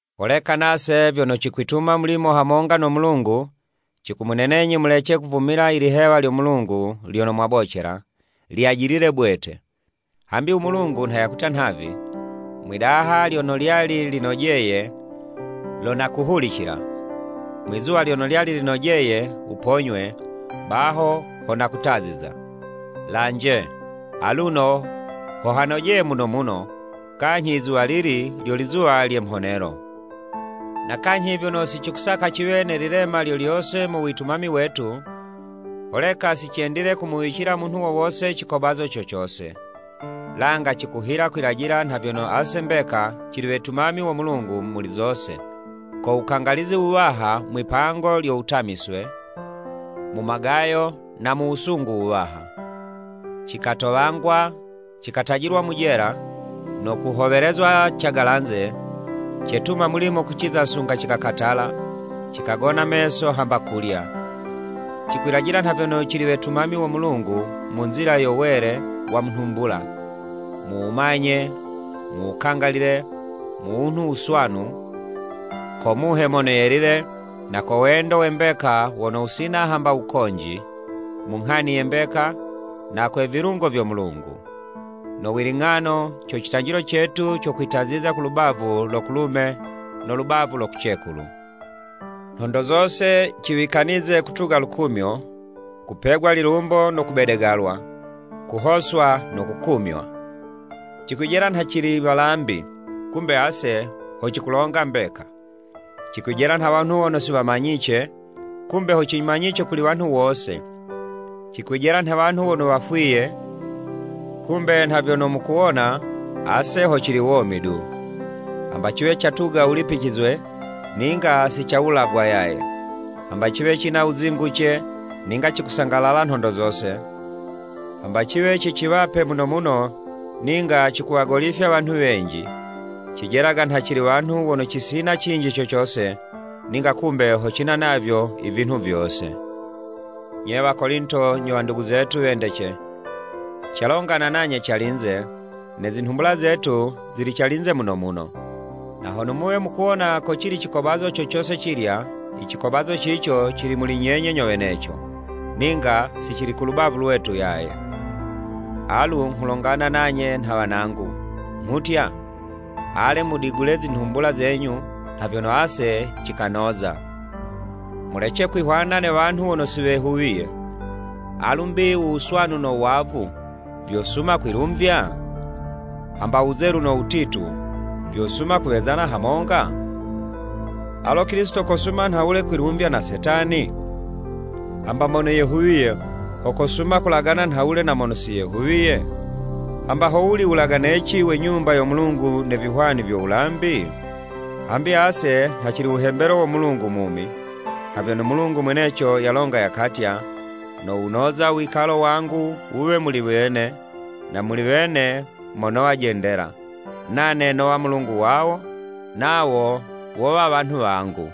Holeka nase vyono cikwituma mulimo hamonga no Mulungu, cikumunenenyi mulece kuvumila i lihewa lyo Mulungu lyono mwabocela, lyajilile bwete. Hambi u Mulungu nha yakutya nhavi; “Mwi'daha lyono lyali linojeye, lo nakuhulicila. Mwi'zuwa lyono lyali linojeye wuponywe, baho ho nakutaziza.” Lanje, aluno ho hanojeye muno muno, kanyhi izuwalili lyo lizuwa lye mhonelo! Na kanyhi vyono si cikusaka ciwe ne lilema lyo lyose mu witumami wetu, holeka si cendile kumuwicila munhu wo wose cikobazo co cose. Langa cikuhila kwilajila nha vyono ase mbeka cili wetumami wo Mulungu muli zose, ko wukangalizi wuwaha mwi'pango lyo wutamiswe, mu magayo na mu wusungu wuwaha. Cikatowangwa, cikatajilwa mu jela, no kuhowelezwa cagalanze, cetuma mulimo kuciza sunga cikakatala, cikagona meso hamba kulya. Cikwilajila nha vyono cili wetumami wo Mulungu mu nzila yo wele wa mu nhumbula, mu wumanye, mu wukangalile, mu wunhu wuswanu, ko Muhe Mono Yelile, na ko wendo we mbeka wono wusina hamba wukonji, mu nghani ye mbeka, na kwe vilungo vyo Mulungu. No wiling'ano, co citwalo cetu co kwitaziza ku lubavu lo kulume no lubavu lo kucekulu. Nhondo zose ciwikanize kutuga lukumyo, kupegwa lilumbo no kubedegalwa, kuhoswa no kukumywa. Cikwijela nha cili walambi, kumbe ase ho cikulonga mbeka, cikwijela nha wanhu wono si wamanyice, kumbe ho cimanyice kuli wanhu wose, cikwijela nhe wanhu wono wafwiye, kumbe nha vyono mukuwona, ase ho cili womi du. Hamba ciwe catuga wulipicizwe, ninga si cikawulagwa yaye, hamba ciwe cina wuzinguce, ninga cikusangalala nhondo zose, hamba ciwe ciciwape muno muno, ninga cikuwagolifya wanhu wenji, cijelaga nha cili wanhu mono cisina cinji co cose, ninga kumbe ho cina navyo i vinhu vyose. Nye Wakolinto nyo wandugu zetu wendece, calongana nanye calinze, ne zinhumbula zetu zili calinze muno muno. Na hono muwe mukuwona ko cili cikobazo co cose cilya, i cikobazo cico cili muli nyenye nyo weneco, ninga si cili kulubavu lwetu yaye. Alu nghulongana nanye nha wanangu, nghutya, ale mudigule zinhumbula zenyu, nha vyono ase cikanoza. Mulece kwihwana ne wanhu wono si wehuwiye. Alu 'mbi u wuswanu no wavu, vyosuma kwilumvya? Hamba u Wuzelu no wutitu, vyosuma kuwezana hamonga? Alo Kilisito kosuma nhawule kwilumvya na Setani? Hamba mono yehuwiye, ho kosuma kulagana nhawule na mono si yehuwiye? Hamba howuli wulaganeci we Nyumba yo Mulungu ne vihwani vyo wulambi? Hambi ase nha cili wuhembelo wo Mulungu mumi. Nha vyono Mulungu mweneco yalonga yakatya, “Nowunoza u wikalo wangu wuwe muli wene, na muli wene mo nowa jendela, nane nowa Mulungu wawo, nawo wowa wanhu wangu.”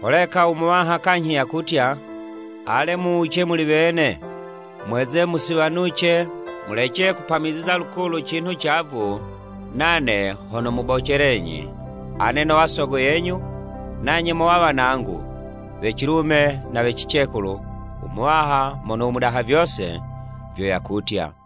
Holeka u Muwaha kanyhi yakutya, “Ale muwuce muli wene, mweze musiwanuce mulece kupamiziza lukulu cinhu cavu nane ho nomubocelenyi. Ane nowa Sogo yenyu, nanye mowa wanangu, we cilume na we cicekulu u Muwaha Mono u Mudaha Vyose, vyo yakutya.”